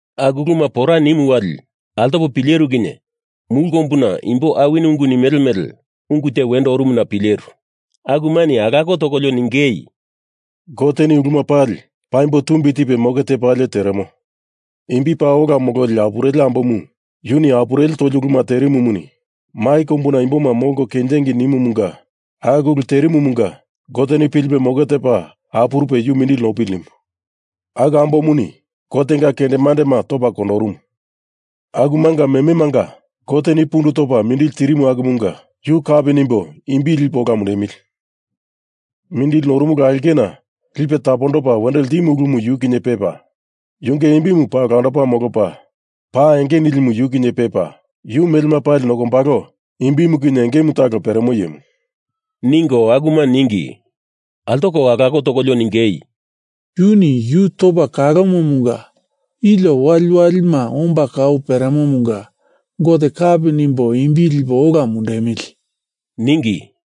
Aku uluma pora nimu wali altopo pileru kinye mulu kombuna imbo awini ungu nimele mele ungu te wendo orumuna pileru. Akumani alako tokolio ningei, “Goteni uluma pali paimbo tumbi tipe moke tepalie teremo. Imbi paa ola mololi apureli ambomu yuni apureli toli uluma terimumuni mai kombuna imboma molko kenjingei nimumunga aku ulu terimuma Goteni pilipe moke tepa apurupe yu mindili nopili nimu. Aku ambomuni Gotenga kendemandema topa kondorumu akumanga mememanga Goteni pundu tondopa mindili tirimu akumunga yu kapi nimbo imbi lipo ola mundemili! Mindili noromulu aulkena lipe tapondopa wendo ltimo ulumu yu kinye pepa, yunge imbi paa olandopa molopa, pa enge nilimu yu kinye pepa, yu melema pali nokombalo imbimu kinye engemu talo peremo iyemu,” ningo akume ningi. Altoko alako tokolio ningei, “Yuni yu topa kalomomunga ilio waliwalima omba kau peremomunga Gote kapi nimbo imbi lipo ola mundemili!” ningi.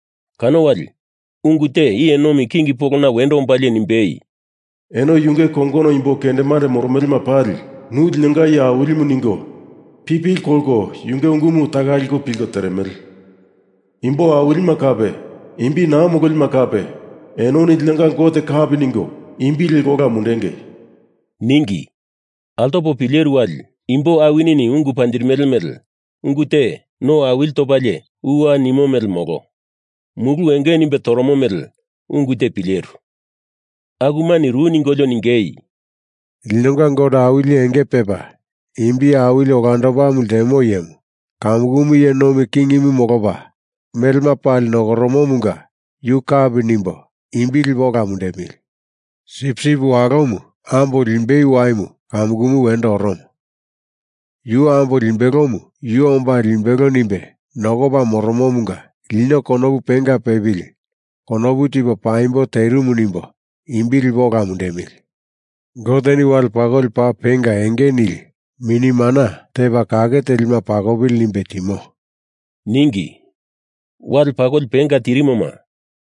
Kano wali ungu te iye nomi king polona wendo ombalie nimbei, “Eno yunge kongono imbo kendemande moromelema pali, Nu linonga iye Awilimu ningo pipili kolko yunge ungumu taka liko pilko teremele. Imbo awilima kape imbi naa mololima kape enoni linonga Gote kapi ningo imbi liko ola mundengei!” ningi. Altopo pileru wali, imbo awinini ungu panjirimele mele ungu te, no awili topalie uwa nimo mele molo, mulu enge nimbe toromo mele ungu te pileru. Akumani ru ningolio ningei, “Linonga Gote Awili Enge Pepa Imbi Awili Olandopamu Ltemo Iyemu kamukumu iye nomi kingimu molopa melema pali nokoromomunga yu kapi nimbo imbi lipo ola mundemili! Sipsip Walomu ambo limbei waimu kamukumu wendo oromo. Yu ambo limbelomu Yu omba limbelo nimbe nokopa moromomunga lino konopu penga pepili konopu tipo paimbo terimu nimbo imbi lipo ola mundemili! Goteni wale pakoli paa penga enge nili mini mana tepa kake telima pakopili nimbe timo,” ningi. (Wale pakoli penga tirimoma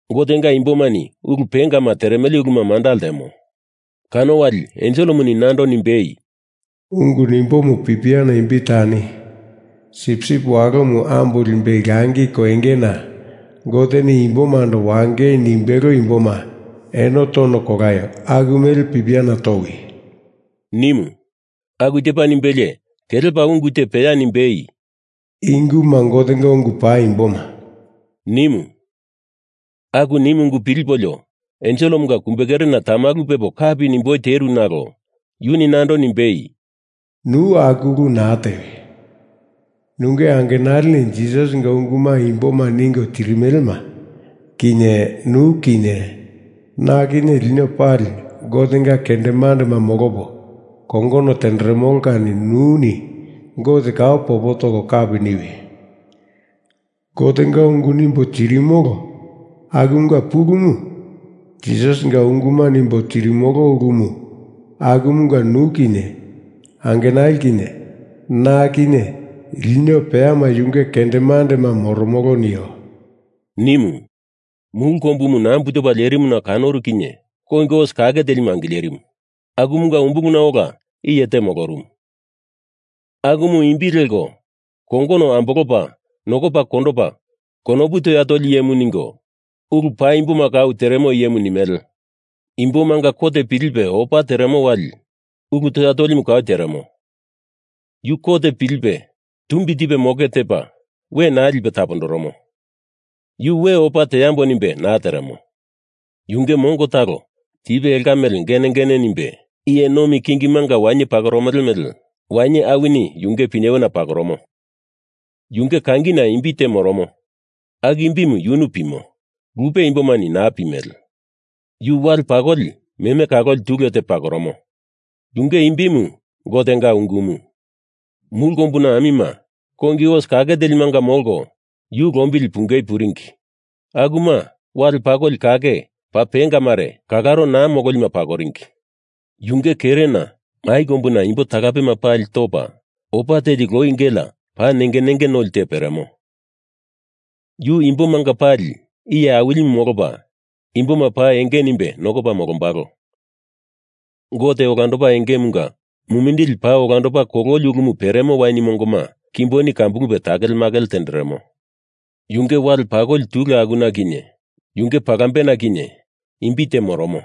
Gotenga imbomani ulu pengama teremele uluma manda ltemo.) Kano wali enselemuni nando nimbei, “Ungu nimbomu pipiana imbi tani, Sipsip Walomu ambo limbei langi koingena Goteni imbomando wangei nimbelo imboma eno tono kolaio! aku mele pipiana towi!” nimu. Aku tepa nimbelie kelepa ungu te peya nimbei, “I unguma Gotenga ungu paimboma,” nimu. Aku nimu ungu pilipolio enselemunga kumbe kerena tamalu pepo kapi nimboi teru nalo yuni nando nimbei, “Nu aku ulu naa tewi! Nunge angenalini Jisasinga unguma imboma ningo tirimelema kinye nu kinye na kinye lino pali Gotenga kendemandema molopo kongono tenderemolo kani nuni Gote kau popo toko kapi niwi! Gotenga ungu nimbo tirimolo akumunga pulumu Jisasinga unguma nimbo tirimolo ulumu akumunga nu kinye angenali kinye na kinye lino peyama yunge kendemandema moromolo, nio,” nimu. Mulu kombumu nambu topa lerimuna kanoru kinye kongi os kake telimu angilerimu, akumunga umbuluna ola iye te molorumu, akumu imbi leko Kongono Ambolopa Nokopa Kondopa Konopu Toya Toli Iyemu ningo, Ulu Paimboma Kau Teremo Iyemu nimele. Imbomanga kot pilipe opa teremo wali ulu toya tolimu kau teremo. Yu kot pilipe tumbi tipe moke tepa we naa lipe tapondoromo. Yu we opa teambo nimbe naa teremo. Yunge mongo talo tipe elka mele genegene nimbe iye nomi kingima wainye pakoromele mele wainye awini yunge pinyewena pakoromo. Yunge kangina imbi te moromo, aku imbimu yunu pimo, lupe imbomani naa pimele. Yu wale pakoli meme kaloli tule te pakoromo. Yunge imbimu Gotenga Ungumu. Mulu kombuna amima kongi os kake telimanga molko yu lombili pungei puringi. Akuma wale pakoli kake paa penga mare, kalaro naa mololima pakoringi. Yunge kerena mai kombuna imbo talapema pali topa opa teli loi gelea paa nenge nenge noli te peremo. Yu imbomanga pali iye awilimu molopa imboma paa enge nimbe nokopa molombalo. Gote Olandopa Engemunga mumindili paa olandopa kololi ulumu peremo wain mongoma kimboni kambulupe takelemakele tenderemo. Yunge wale pakoli tule akuna kinye yunge palambena kinye imbi te moromo,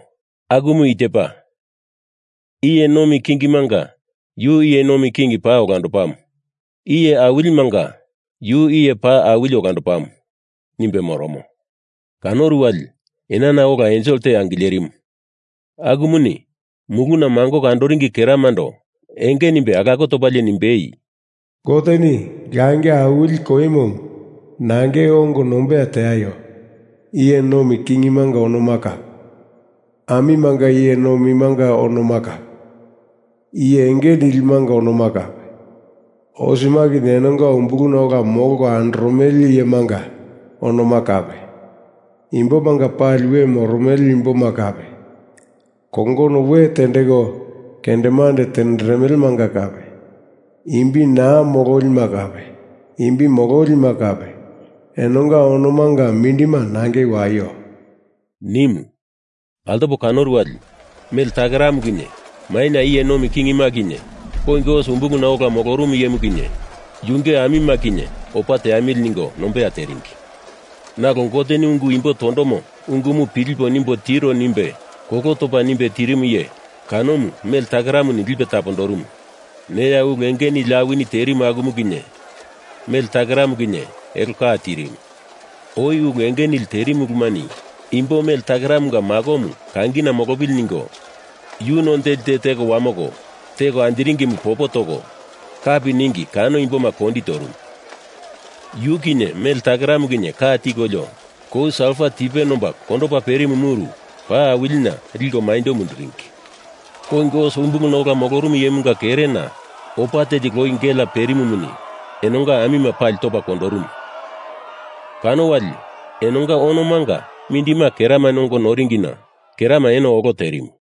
akumu i tepa: Iye Nomi Kingimanga Yu Iye Nomi King Paa Olandopamu, Iye Awilimanga Yu Iye Paa Awili Olandopamu, nimbe moromo. Kanoru wali enana ola ensel te angilerimu, akumuni muluna mangoko andoringi keramando enge nimbe alako topalie nimbei, “Goteni langi awili koimomu nangei ongo nombeya teaio! Iye nomi kingimanga onoma kape, amimanga iye nomimanga onoma kape, iye enge nilimanga onoma kape, osema kinye enonga umbuluna ola molko andoromele iyemanga onoma kape, imbomanga pali we moromele imboma kape, kongono we tendeko kendemande tenderemelemanga kape, imbi naa mololima kape, imbi mololima kape, enonga onomanga mindima nangei waio,” nimu. Altopo kanoru wali mele takeramu kinye maina iye nomi kingima kinye kongi os umbuluna ola moromo iyemu kinye yunge amima kinye opa teamili ningo nombeya teringi. Nalo Goteni ungu imbo tondomo ungumu pilipolio nimbo tiro nimbe kolo topa nimbe tirimu iye, kanomu mele takeramuni lipe tapondorumu neya ulu enge nili awini terimu akumu kinye, mele takeramu kinye, elo ka tirimu. Oi ulu enge nili terimu ulumani imbo mele takeramunga makomu kangina molopili ningo, yu none teli te teko wamoko teko anjiringimu popo toko kapi ningi kano imboma kondi torumu. Yu kinye mele takeramu kinye ka tikolio, kou salfa tipe nomba kondopa perimu muru paa awilina liko maindo munduringi. Kongi os umbuluna ola molorumu iyemunga kerena opa teli loi gelea perimumuni enonga amima pali topa kondorumu, kano wali enonga onomanga mindima keramani ongo noringina kerama eno olo terimu.